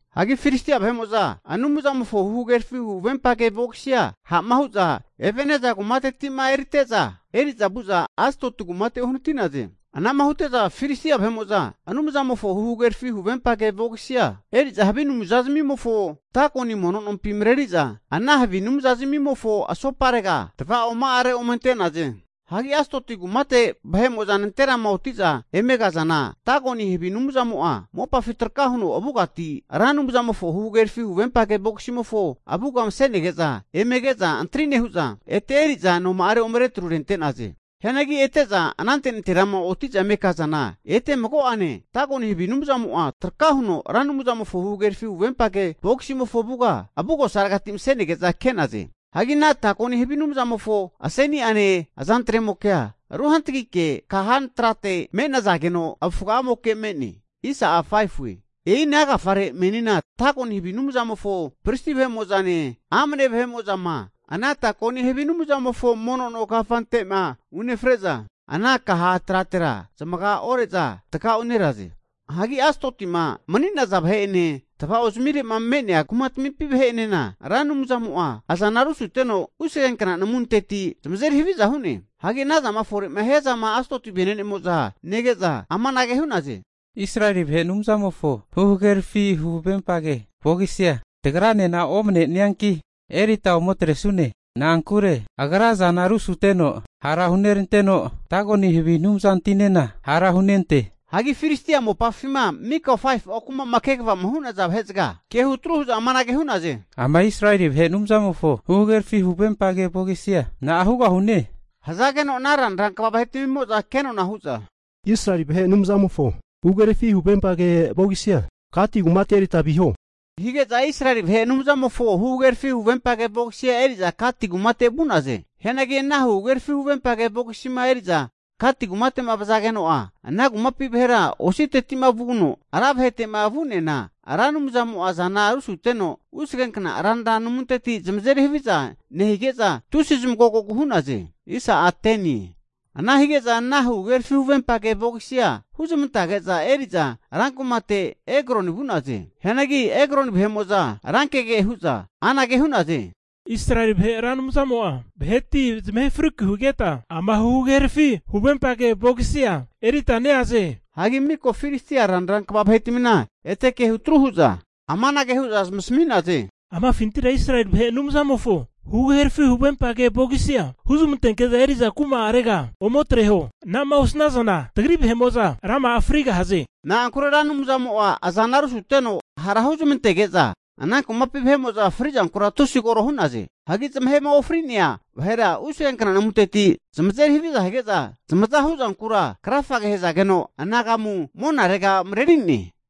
Hagi Filistia vahe'mo'za Anumzamofo huhagerafi huvempage vogisia ha'ma hu'za Ebeneza kumatetima erite'za, eri'za vu'za Asdoti kumate uhanati'naze. Anama hute'za Filistia vahe'mo'za Anumzamofo huhagerafi huvempage vogisia eri'za havi anumzazimimofo Dagoni mono nompi mareri'za, ana havi anumzazamimofo asoparega tava'oma'are ome ante'naze. Hagi Asdoti kumate vahe'mo'za nanterama oti'za eme kazana Dagoni havi anumzamo'a mopafi traka huno avugati Ra Anumzamofo huhagerafi huvempage vogisimofo avuga mase'nege'za eme ke'za antri nehu'za, ete eri'za noma'are ome retrurente'naze. Hianagi ete'za anante nanterama oti'za eme kazana ete mago'ane Dagoni havi anumzamo'a traka huno Ra Anumzamofo huhagerafi huvempage vogisimofo avuga avugosaregati mase'nege'za ke'naze. Hagi ana Dagoni havi anumzamofo aseni'ane azantremokea ruhantagike kahantrate me'nazageno avufga'amoke me'ne. E'ina agafare meninena Dagoni havi anumzamofo pristi vahe'mo'zane amane vahe'mo'zama ana Dagoni havi anumzamofo mono no kafante'ma unefre'za, ana kaha tratera zamaga ore'za takauneraze. Hagi Asdotima mani'naza vahe'ene, tva'ozamire'ma me'nea kumatamimpi vahe'enena Ra Anumzamo'a azana rusuteno usgenkna namunteti zamazeri haviza hu'ne. Hagi anazama fore'ma hiazama Asdoti vene'nemo'za nege'za amanage hu'naze, Israeli vahe Anumzamofo huhagerafi huvempage vogisia tagranena omanenianki, erita ome atresune. Na'ankure Agra azana rusuteno hara huneranteno, Dagoni havi anumzantinena hara hunente. Hagi Filistia mopafima mika 5fu'a kuma'ma kvama hu'naza vahezaga ke hutru hu'za amanage hu'naze, ama Israeli vahe Anumzamofo huhagerafi huvempage vogisia na'a hugahune? Hazageno ana ranra kva vahetamimo'za kenona hu'za, Israeli vahe Anumzamofo huhagerafi huvempage vogisia Gati kumate erita viho, hazage'za Israeli vahe Anumzamofo huhagerafi huvempage vogisia eri'za Gati kumate vu'naze. Hianagi ana huhagerafi huvempage vogisima eri'za Gati kumate'ma vazageno'a, ana kumapi vahera ositeti'ma vuno ra vahete'ma vu'neana Ra Anumzamo'a azana rusuteno usagenkna ranra namunteti zamazeri haviza nehige'za tusi zamagogogu hu'naze. Ana hige'za ana huhagerafi huvempage vogisia huzmantazage'za eri'za rankumate Ekroni vu'naze. Hianagi Ekroni vahe'mo'za rankege hu'za amanage hu'naze, Israeli vahe Ra Anumzamo'a vahetia zamahe friku higeta ama huhagerafi huvempage vogisia erita neaze. Hagi miko Filistia ranra kva vahetamina ete ke hutru hu'za amanage hu'za zamasami'naze, amafintira Israeli vahe Anumzamofo huhagerafi huvempage vogisia huzmantenke'za eri'za kuma'arega ometreho. Ana'ma osanazana tagri vahe'mo'za rama'a frigahaze. Na'ankure Ra Anumzamo'a azana rusuteno hara hunezmantege'za, ana kumapi vahe'mo'za fri'zankura tusi koro hu'naze. Hagi zamahema ofri'nea vahera usagenkna namunteti zamazeri haviza hige'za zamaza huzankura krafage hazageno anagamu monarega mareri'ne.